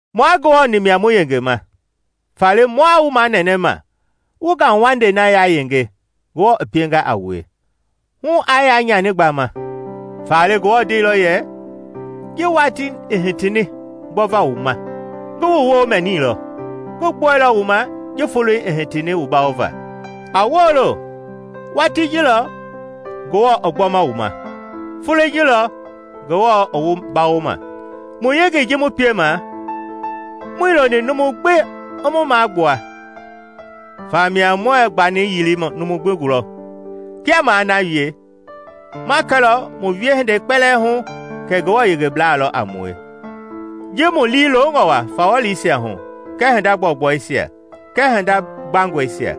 Mua Ngewɔ-ni mia mu yengema faale mua wu manɛnɛma wu ngauwandei na yayenge Ngewɔ i pienga a wue, hu aa nyani gbama. Faale Ngewɔ ndeilɔ yɛ, “Ji watii i hitini gbɔva wu ma, ngi wu woo mɛnilɔ, Ngi gbɔilɔ wu ma ji foloi i hitini wu bawo va.” A woolo! Watii ji lɔ Ngewɔ i gbɔma wu ma! Foloi ji lɔ Ngewɔ i wu bawoma! Mu yengei ji mu piema, muii loni numu gbi i mu magbua, famia muɛɛ gbani yili numu gbi gulɔ. Kia maa na wie, ma kɛlɔ mu wiehindei kpɛlɛɛ hu kɛ Ngewɔ yengeblaa lɔ a mue ji mu liilongɔ wa fawɔliisia hu kɛɛ hinda gbɔugbɔisia kɛɛ hinda gbangɔisia.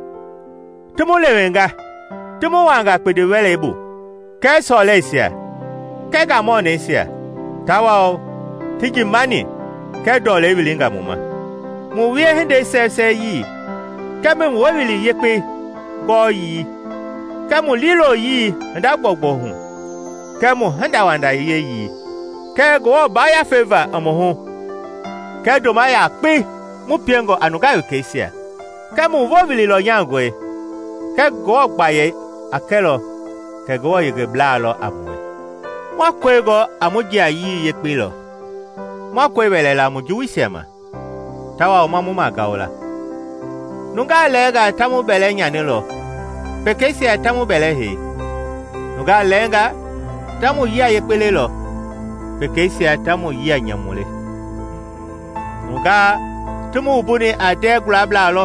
Ti mu lewenga ti mu wunga kpindi-wɛlei bu, kɛɛ sɔlɛisia kɛɛ ngamɔnɛisia, tawao ti njii-manii kɛɛ, ndɔlei wilinga mu ma. Mu wiehindei sɛwɛsɛwɛyii kɛɛ mu Wowili Yekpei gɔɔyii kɛɛ mu liiloyii hinda gbɔugbɔu hu kɛɛ mu hindawanda wieyii, kɛɛ Ngewɔ Yafei va i mu hu kɛɛ ndoma yekpei mu piengɔ a nungaa wekeisia, kɛɛ mu Wowili lɔnyangɔi kɛɛ Ngewɔ gbayei a kɛlɔ kɛ Ngewɔ yengebla lɔ a mue. Ma kɔi gɔ a mu jiayii yekpei lɔ, ma kɔi wɛlɛ la mu juwuisia ma, tawao ma mu magao la. Nungaa lɛɛnga ta mu bɛlɛ nyanilɔ, pekeisia ta mu bɛlɛ hei; nungaa lɛɛngaa ta mu yia yekpe lelɔ, pekeisia ta mu yia nyamu le. Nungaa ti mu wumbuni a ndɛɛ gualablaa lɔ,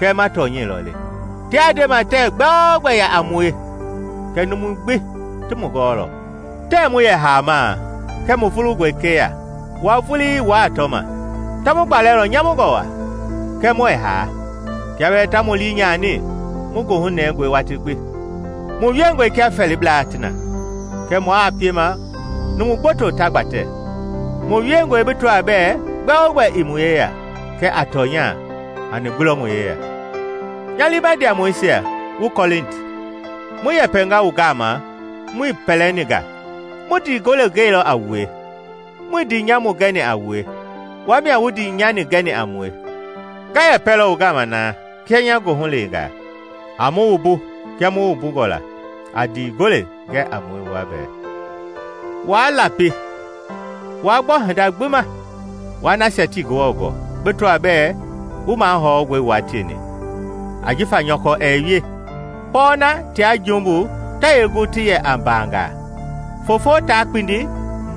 kɛɛ ma tɔnyɛi lɔ le. Tiaa ndema tɛɛ gbɛogbɛ yaa a mue kɛɛ numui gbi ti mu gɔɔlɔ; tɛɛ mu yɛ haama kɛɛ mu vulungɔe keya, wua vulii wuaa tɔma. Ta mu gbalɛlɔ nyamungɔ waa, kɛɛ muɛɛ haa; kia bɛɛ ta mu lii nyani, mu goohu nɛngɔe watii gbi; mu wiengɔe kia fɛɛlibla ti na, kɛɛ mua piema numu gboto ta gbatɛ; mu wiengɔe bi tɔaa bɛɛ gbɛogbɛ ii mu yeya, kɛɛ a tɔnya, hani gbi lɔ mu yeya. Nya liima ndiamɔisia wu Kɔlinti, mu yɛpɛnga wu gama muii pɛlɛni nga; mu ndii gole gɛilɔ a wue. Muii ndii nyamu gɛni a wue; wua mia wu ndii nyani gɛni a mue. Nga yɛpɛlɔ wu gama na kia nya goohu leengaa; a mu wumbu kia mu wu wumbungɔ la. A ndii gole gɛ a mue wua bɛɛ. Waa lapi waa gbɔ hinda gbi ma wua nasia tii Ngewɔ gɔɔ bi tɔaa bɛɛ wu mahɔngɔe wua tieni, ajifa nyɔkɔ ɛɛ wie. Pɔɔna tia jumbu ta yee gu ti yɛ a mbaangaa? Foofo taa kpindi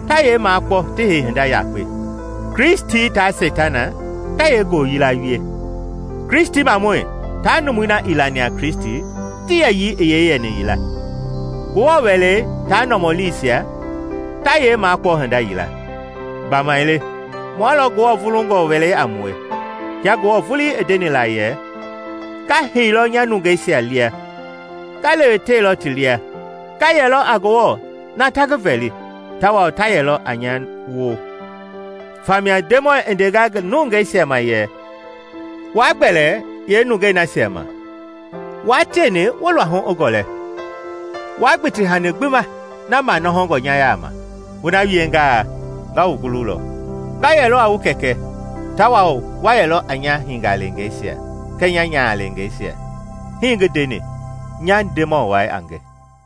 ta yee makpɔ ti hei hinda yakpe? Kristi taa Seitana ta yee ngooyila wie? Kristimamɔi taa numui na ii lani a Kristi ti yɛyii i yee yɛni yila? Ngewɔ wɛlei taa nɔmɔliisia ta yee makpɔ hinda yila? Gbamaile mua lɔ Ngewɔ vulungɔe wɛlei a mue! Kia Ngewɔ vulii i ndeni la yɛ, “Nga heilɔ nya nungeisia lia nga lewetewe ti lia; nga yɛlɔ a Ngewɔ na ta ngi vɛli, tawao ta yɛlɔ a nya woo.” Famia Ndemɔi i ndenga ngi nungeisia ma yɛ, “Wa gbɛle lɔ yee nungei nasia ma, wua tieni wu luahu i gɔlɛ. Waa gbiti hani gbi ma na nɔhɔngɔ nya yaama, wu na wiengaa nga wu gululɔ. Nga yɛlɔ a wu Kɛkɛ, tawao wa yɛlɔ a nya hingaleengeisia kɛɛ nya nyahaleengeisia, hii ngi ndeni, nya Ndemɔ wai a nge.”